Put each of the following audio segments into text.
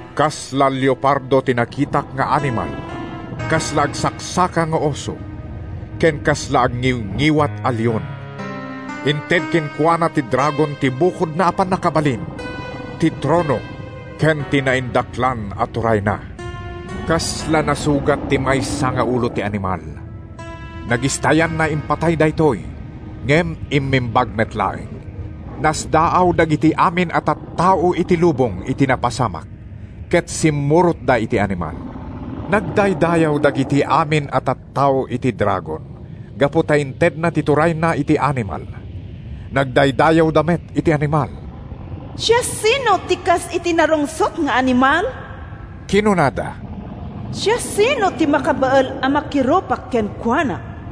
Kasla leopardo ti nakitak nga animal, kasla agsaksaka nga oso, ken kasla agngiwngiwat a leon. Inted kenkuana ti dragon ti bukodna a pannakabalin, ti trono ken ti naindaklan a turayna. Kasla nasugat ti maysa nga ulo ti animal. Nagistayanna impatay daytoy ngem immimbag met laeng. Nasdaaw dagiti amin a tattao iti lubong iti napasamak ket simmurotda iti animal. Nagdaydayaw dagiti amin a tattao iti dragon gapu ta intedna ti turayna iti animal. Nagdaydayawda met iti animal. “Siasino ti kas iti narungsot nga animal?” kinunada. “Siasino ti makabael a makirupak kenkuana?”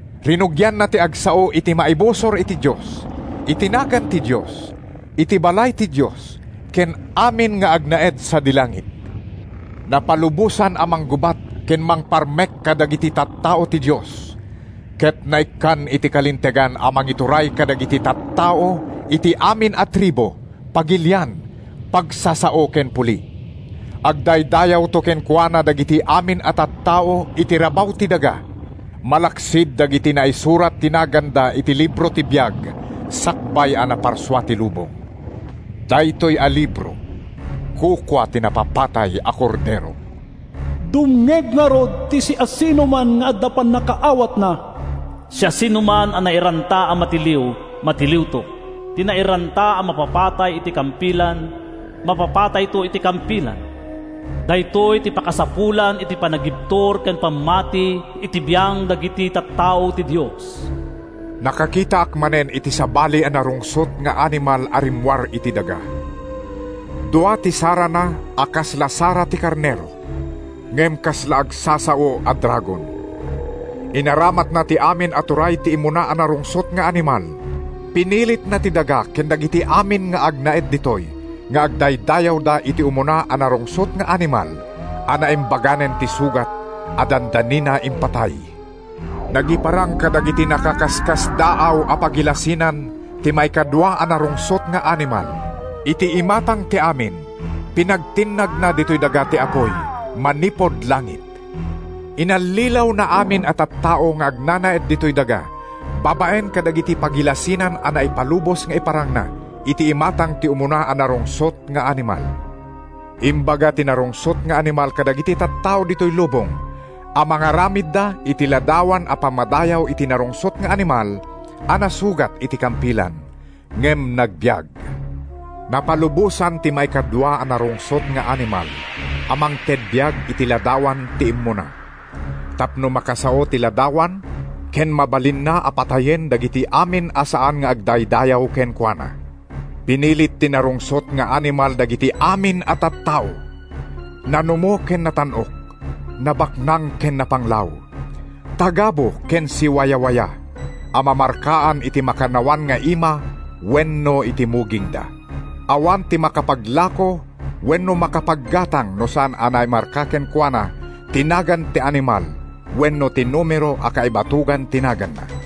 Rinugianna ti agsao iti maibusor iti Dios, iti nagan ti Dios, iti balay ti Dios ken amin nga agnaed sadi langit. Napalubosan a manggubat ken mangparmek kadagiti tattao ti Dios, ket naikkan iti kalintegan a mangituray kadagiti tattao iti amin a tribu, pagilian, pagsasao ken puli. Agdaydayawto kenkuana dagiti amin a tattao iti rabaw ti daga, malaksid dagiti naisurat ti naganda iti libro ti biag sakbay a naparsua ti lubong. Daytoy a libro kukua ti napapatay a Kordero. “Dumngeg ngarud ti siasinoman nga adda pannakaawatna! Siasinoman a nairanta a matiliw, matiliwto. Ti nairanta a mapapatay iti kampilan, mapapatayto iti kampilan. Daytoy ti pakasapulan iti panagibtur ken pammati iti biang dagiti tattao ti Dios.” Nakakitaak manen iti sabali a narungsot nga animal a rimmuar iti daga. Dua ti sarana a kasla sara ti karnero, ngem kasla agsasao a dragon. Inaramatna ti amin a turay ti immuna a narungsot nga animal. Pinilitna ti daga ken dagiti amin nga agnanaed ditoy nga agdaydayawda iti umuna a narungsot nga animal a naimbaganen ti sugat a dandanina impatay. Nagiparang kadagiti nakaskasdaaw a pagilasinan ti maikadua a narungsot nga animal. Iti imatang ti amin, pinagtinnagna ditoy daga ti apuy manipud langit. Inallilawna amin a tattao nga agnanaed ditoy daga babaen kadagiti pagilasinan a naipalubos nga iparangna iti imatang ti umuna a narungsot nga animal. Imbaga ti narungsot nga animal kadagiti tattao ditoy lubong a mangaramidda iti ladawan a pammadayaw iti narungsot nga animal a nasugat iti kampilan ngem nagbiag. Napalubosan ti maikadua a narungsot nga animal a mangted biag iti ladawan ti immuna, tapno makasao ti ladawan ken mabalinna a patayen dagiti amin a saan nga agdaydayaw kenkuana. Pinilit ti narungsot nga animal dagiti amin a tattao, nanumo ken natan-ok, nabaknang ken napanglaw, tagabu ken siwawayawaya, a mamarkaan iti makannawan nga ima wenno iti mugingda. Awan ti makapaglako wenno makapaggatang no saan naimarka kenkuana ti nagan ti animal wenno ti numero a kaibatogan ti naganna.